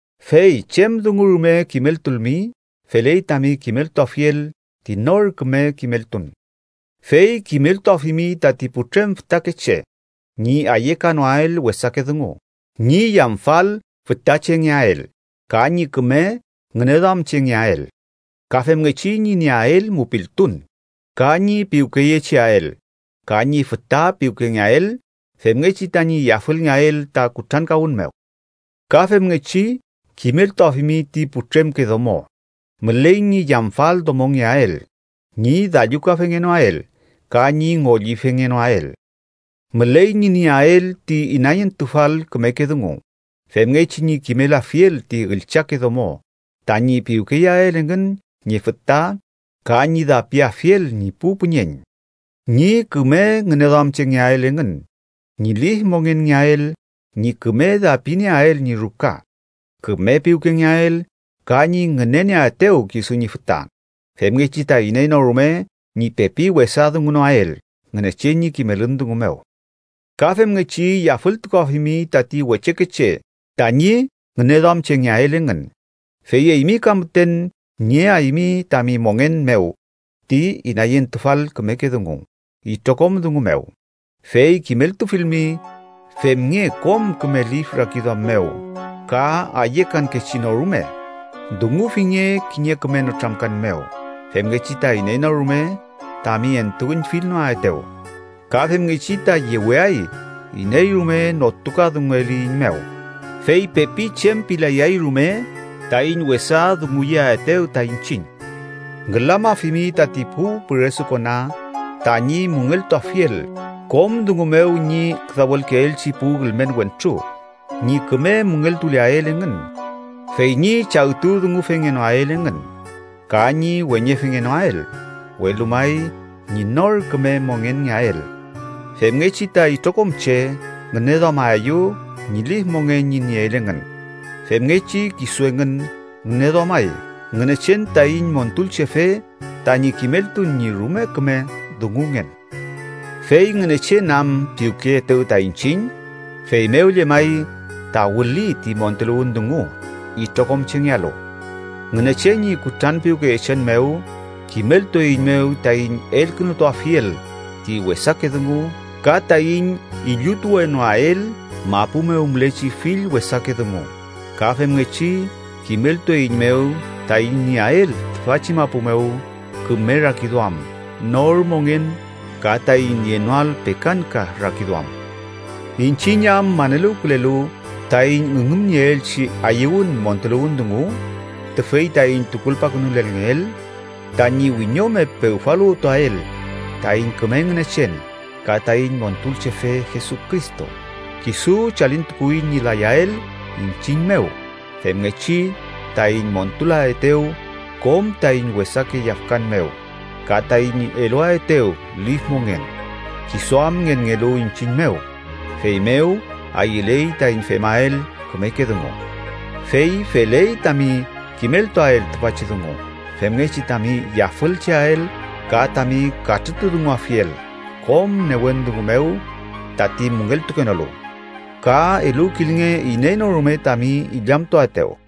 Fey chem dungu rume kimeltulmi, feley tami kimeltuafiel ti nor küme kimeltun. Fey kimeltuafimi tati putrem fütakeche ñi ayekanoael wesake dungu, ñi yamfal fütachengeael ka ñi küme ngüneduamchengeael. Ka femngechi ñi nieael mupiltun, ka ñi piwkeyecheael ka ñi füta piwkengeael, femngechi tañi yafüngeael ta kutrankawün mew. Ka femngechi kimeltuafimi ti putremke domo müley ñi yamfaldomongeael, ñi dallukafengenoael ka ñi ngollifengenoael. Müley ñi nieael ti inayentufal kümeke dungu, femngechi ñi kimelafiel ti üllchake domo tañi piwkeyeael engün ñi füta ka ñi dapiafiel ñi pu püñeñ, ñi küme ngüneduamchengeael engün, ñi lif mongenngeael, ñi küme dapinieael ñi ruka, küme piwkengeael ka ñi ngünenieaetew kisu ñi füta, femngechi ta iney no rume ñi pepi wesa dungunoael Ngünechen ñi kimelün dungu mew. Ka femngechi yafültukuafimi tati wechekeche tañi ngüneduamchengeael engün. Fey eymi ka müten nieaymi tami mongen mew ti inayentufal kümeke dungu itrokom dungu mew. Fey kimeltufilmi, femnge kom küme lif rakiduam mew ka ayekankechi no rume. Dungufinge kiñe küme nütramkan mew, femngechi ta iney no rume tami entuüñfilnoaetew. Ka femngechi ta yeweay iney rume notukadungueliyiñmew, fey pepi chem pilayay rume taiñ wesa dunguyeaetew ta iñchiñ. Ngülamafimi tati pu püresukona tañi müngeltuafiel kom dungu mew ñi küdawelkeelchi pu ülmen wentru, ñi küme müngeltuleael engün, fey ñi chagtudungufengenoael engün. Ka ñi weñefengenoael, welu may ñi nor küme mongenngeael. Femngechi ta itrokom che ngüneduamaeyew ñi lif mongen ñi nieel engün, femngechi kisu engün ngüneduamay Ngünechen taiñ Montulchefe tañi kimeltun ñi rume küme dungungen. Fey Ngünechen am piwkeyeetew ta iñchiñ, feymew llemay ta wüli ti montuluwün dungu itrokom chengealu. Ngünechen ñi kutranpiwkeyechen mew kimeltueiñmew taiñ elkünutuafiel ti wesake dungu ka taiñ illutuwenoael mapu mew mülechi fill wesake dungu. Ka femngechi kimeltueiñmew taiñ nieael tüfachi mapu mew küme rakiduam, nor mongen, ka taiñ nienoael pekakanka rakiduam, iñchiñ am maneluwkülelu taiñ üngümnieelchi ayüwün montuluwün dungu tüfey taiñ tukulpakünulelngeel: tañi wiñome pewfaluwtuael taiñ küme Ngünechen ka taiñ Montulchefe Jesucristo. Kisu chalintukuwi ñi layael iñchiñ mew femngechi taiñ montulaetew kom taiñ wesake yafkan mew ka taiñ eluaetew lif mongen, kisu am ngenngelu iñchiñ mew, feymew ayüley taiñ femael kümeke dungu. Fey feley tami kimeltuael tüfachi dungu, femngechi tami yafülcheael ka tami katrütudunguafiel kom newen dungu mew tati müngeltukenolu. Ka eluwkilnge iney no rume tami illamtuaetew.